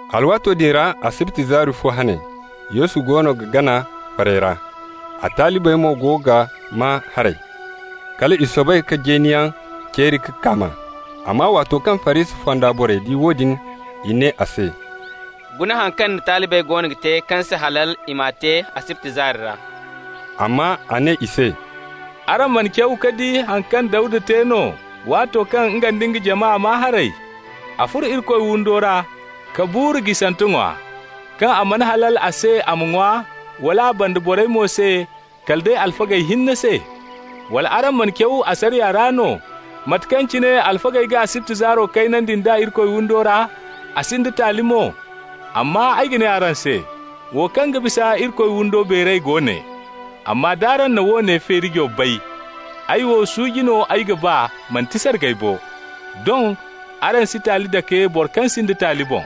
Alwaato din ra, asibti zaari fo hane, Yesu goono ga gana farey ra. A talibey mo go ga maa haray. Kal i soobay ka jeeniyaŋ ceeri ka kaama. Amma waato kaŋ Farisi fonda borey di woodin, i ne a se: «Guna haŋ kaŋ ni talibey goono ga te kaŋ si halal i ma te asibti zaari ra.» Amma a ne i se: «Araŋ mana caw ka di haŋ kaŋ Dawda te no, waato kaŋ nga nda nga jama maa haray? A furo Irikoy fuwo ra ka buuru jisante ŋwa, kaŋ a mana halal a se a ma ŋwa, wala a banda borey mo se, kala day alfagey hinne se? Wala araŋ mana caw asariya ra no, mate kaŋ cine alfagey ga asibti zaaro kaynandi nd'a Irikoy windo ra, i sinda taali mo? Amma ay ga ne araŋ se, wo kaŋ ga bisa Irikoy windo beeray go ne. Amma d'araŋ na woone feerijo bay: ‹Ay wo, suuji no ay ga ba, manti sargay bo› -- doŋ araŋ si taali dake boro kaŋ sinda taali boŋ.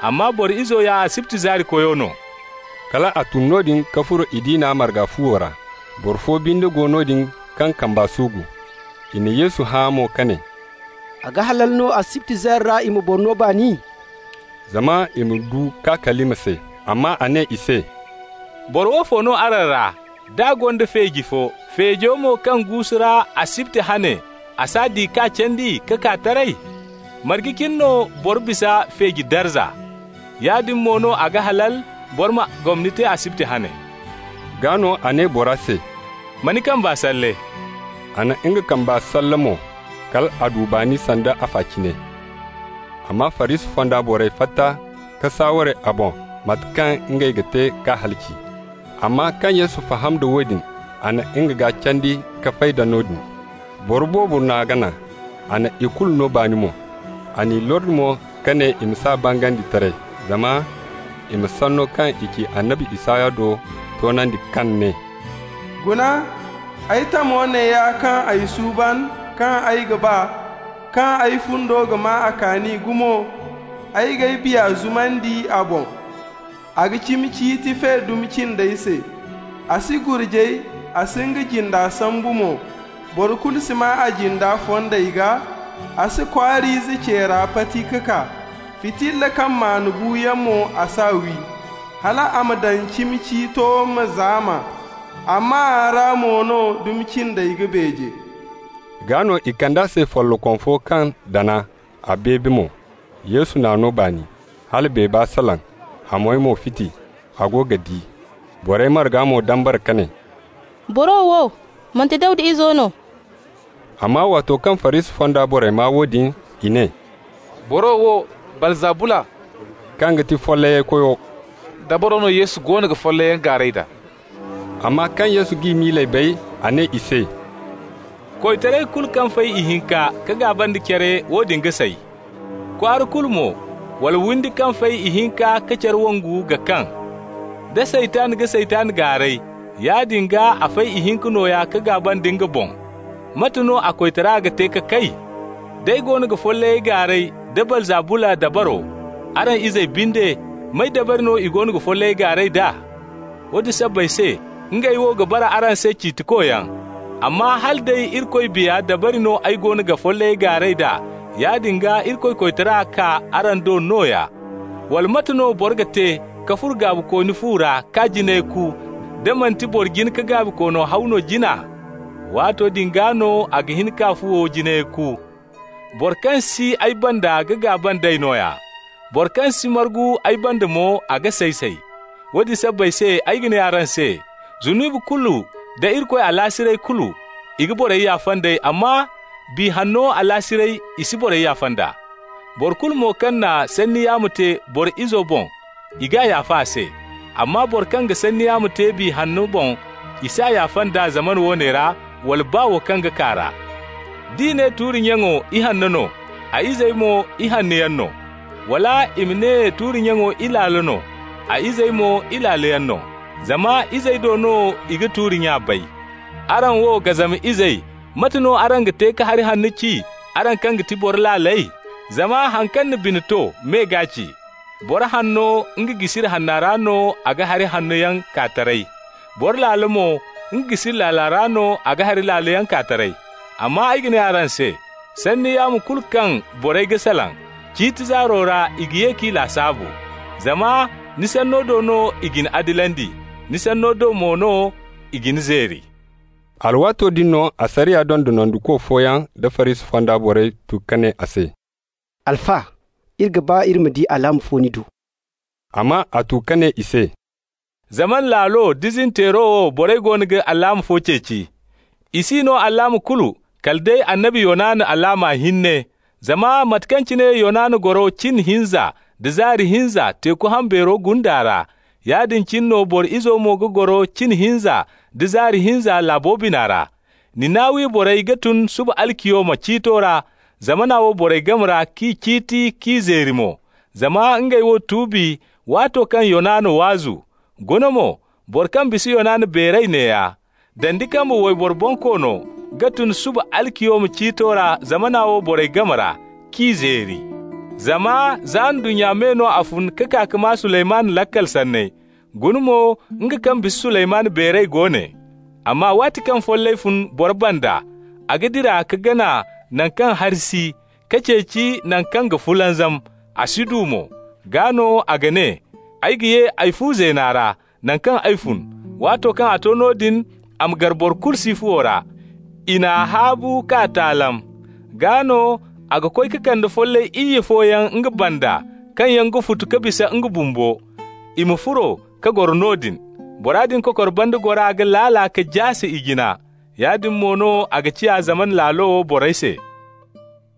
Amma Boro Izo ya asibti zaari Koyo no.» Kal a tun noodin ka furo i diina marga fuwo ra. Boro fo binde go noodin kaŋ kamba suugu. I na Yesu hã mo ka ne: «A ga halal no asibti zaari ra i ma boro no baani?» (zama i ma du k'a kalima se). Amma a ne i se: «Boro woofo no araŋ ra, d'a gonda feeji fo, feejo mo kaŋ guusu ra, asibti hane a s'a di k'a candi ka kaa taray? Marge cine no boro bisa feeji darza! Yaadin mo no a ga halal boro ma gomni te asibti hane.» Gaa no a ne bora se: «Ma ni kamba salle.» A na nga kamba salle mo, kal a du baani sanda afa cine. Amma Farisi fonda borey fatta ka saaware a boŋ, mate kaŋ ngey ga te k'a halaci. Amma kaŋ Yesu faham da woodin, a na nga gaa candi ka fay da noodin. Boro boobo n'a gana, a na ikulu no baani mo. A n'i lordi mo ka ne i ma s'a bangandi taray zama i ma sanno kaŋ i ci annabi Isaya do toonandi, kaŋ ne: «Guna, ay tamo neeya kaŋ ay suuban, kaŋ ay ga ba, Kaŋ ay fundo ga maa a kaani gumo. Ay g'ay Biya zumandi a boŋ, A ga cimi ciiti fe dumi cindey se. A si gurjay, a si nga jinda sambu mo, Boro kulu si maa a jinda fondey gaa. A si kwaar'ize ceera pati ka kaa, Fitilla kaŋ maan buuyaŋ mo, a s'a wi, Hal a ma daŋ cimi ciito ma zaama. A maa ra mo no dumi cindey ga beeje.» Gaa no i kand'a se follokom fo kaŋ dana, a beebe mo. Yesu n'a no baani, hala beeba salaŋ, a moy mo fiti, a go ga di. Borey marga mo dambara ka ne: «Boro wo, manti Dawda izo no?» Amma waato kaŋ Farisi fonda borey maa woodin, i ne: «Boro wo, Baalzabula (kaŋ ga ti follayey koyo) dabaro no Yesu goono ga follayyaŋ gaaray d'a.» Amma kaŋ Yesu g'i miiley bay, a ne i se: «Koytaray kulu kaŋ fay ihinka ka gaaba nda care, woodin ga say. Kwaara kulu mo, wala windi, kaŋ fay ihinka ka care wangu ga kaŋ. Da Saytan ga Saytan gaaray, yaadin gaa a fay ihinka nooya ka gaaba nda nga boŋ. Mate no a koytara ga te ka kay? D'ay goono ga follayey gaaray da Baalzabula dabaro, araŋ izey binde, may dabari no i goono ga follayey gaaray d'a? Woodin sabbay se, ngey wo ga bara araŋ se ciitikoyaŋ. Amma hala day Irikoy Biya dabari no ay goono ga follayey gaaray d'a, yaadin gaa Irikoy koytara kaa araŋ do nooya. Wala mate no boro ga te ka furo gaabikooni fu ra k'a jinay ku, da manti bora jin ka gaabikoono haw no jina? Waato din gaa no a ga hin k'a fuwo jinayey ku. Boro kaŋ si ay banda ga gaaba nd'ay nooya. Boro kaŋ si margu ay banda mo, a ga say-say. Woodin sabbay se ay ga ne araŋ se, zunubi kulu da Irikoy alaasiray kulu, i ga borey yaafa nd'ey, amma Biya Hanno alaasiray i si borey yaafa nd'a. Boro kulu mo kaŋ na sanni yaamo te Boro Izo boŋ, i g'a yaafa a se. Amma bora kaŋ ga sanni yaamo te Biya Hanna boŋ, i s'a yaafa nd'a zamana woone ra wala baa wo kaŋ ga kaa ra. D'i ne tuuri-nyaŋo ihanno no, a izey mo ihanno yaŋ no. Wala i ma ne tuuri-nyaŋo ilaalo no, a izey mo ilaalo yaŋ no. Zama izey do no i ga tuuri-nya bay. Araŋ wo, gazama izey, mate no araŋ ga te ka hari hanno ci, araŋ kaŋ ga ti boro laaley? Zama haŋ kaŋ na bine to, me ga ci. Boro hanno nga jisiri hanna ra no a ga hari hanno yaŋ kaa taray. Boro laalo mo nga jisiri laalo ra no a ga hari laalo yaŋ kaa taray. Amma ay ga ne araŋ se, sanni yaamo kulu kaŋ borey ga salaŋ, ciiti zaaro ra i ga ye k'i lasaabu. Zama ni sanno do no i ga ni adilandi, ni sanno do mo no i ga ni zeeri.» Alwaato din no asariya dondonandiko fooyaŋ da Farisi fonda borey tu ka ne a se: «Alfa, iri ga ba iri ma di alaama fo ni do.» Amma a tu ka ne i se: «Zamana laalo da zina-teero wo borey goono ga alaama fo ceeci. I s'i no alaama kulu kala day annabi Yonana alaama hinne. Zama mate kaŋ cine Yonana goro cin hinza da zaari hinza teeku ham beero gunda ra, yaadin cine no Boro Izo mo ga goro cin hinza da zaari hinza laabo bina ra. Ninawiya borey ga tun suba-aliciyoma ciito ra zamana wo borey game ra k'i ciiti k'i zeeri mo, zama ngey wo tuubi waato kaŋ Yonana waazu. Guna mo, boro kaŋ bisa Yonana beeray neeya. Dandi kambe wayboro bonkoono ga tun suba-aliciyoma ciito ra zamana wo borey game ra, k'i zeeri. Zama za ndunnya me no a fun ka kaa ka maa Suleymanu laakal sanney. Guna mo, nga kaŋ bisa Suleymanu beeray go ne. Amma waati kaŋ follay fun boro banda, a ga dira ka gana naŋ kaŋ hari si, ka ceeci naŋ kaŋ ga fulanzam, a si du mo. Gaa no, a ga ne: ‹Ay ga ye ay fu zeena ra, naŋ kaŋ ay fun.› Waato kaŋ a to noodin a ma gar boro kulu si fuwo ra, i n'a haabu k'a taalam. Gaa no a ga koy ka kande follay iyye fooyaŋ nga banda kaŋ yaŋ ga futu ka bisa nga bumbo, i ma furo ka goro noodin. Bora din kokor banda gora ga laala ka jaase ijina. Yaadin mo no a ga ciya zamana laalo wo borey se.»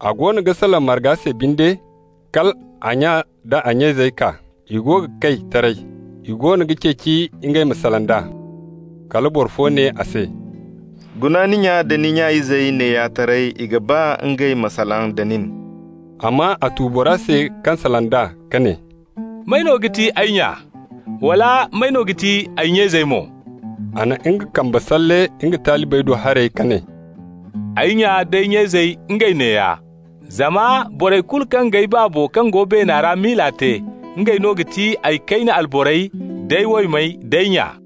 A goono ga salaŋ marga se binde, kal a nya d'a nya izey kaa. I go ga kay taray, i goono ga ceeci ngey ma salaŋ d'a. Kala boro fo ne a se: «Guna, ni nya da ni nya izey neeya taray, i ga ba ngey ma salaŋ da nin.» Amma a tu bora se kaŋ salaŋ d'a, ka ne: «May no ga ti ay nya? Wala may no ga ti ay nya izey mo?» A na nga kambe salle nga talibey do haray ka ne: «Ay nya d'ay nya izey, ngey neeya. Zama borey kulu kaŋ g'ay Baabo kaŋ go beena ra miila te, ngey no ga ti ay kayne alborey, d'ay waymey, d'ay nya.»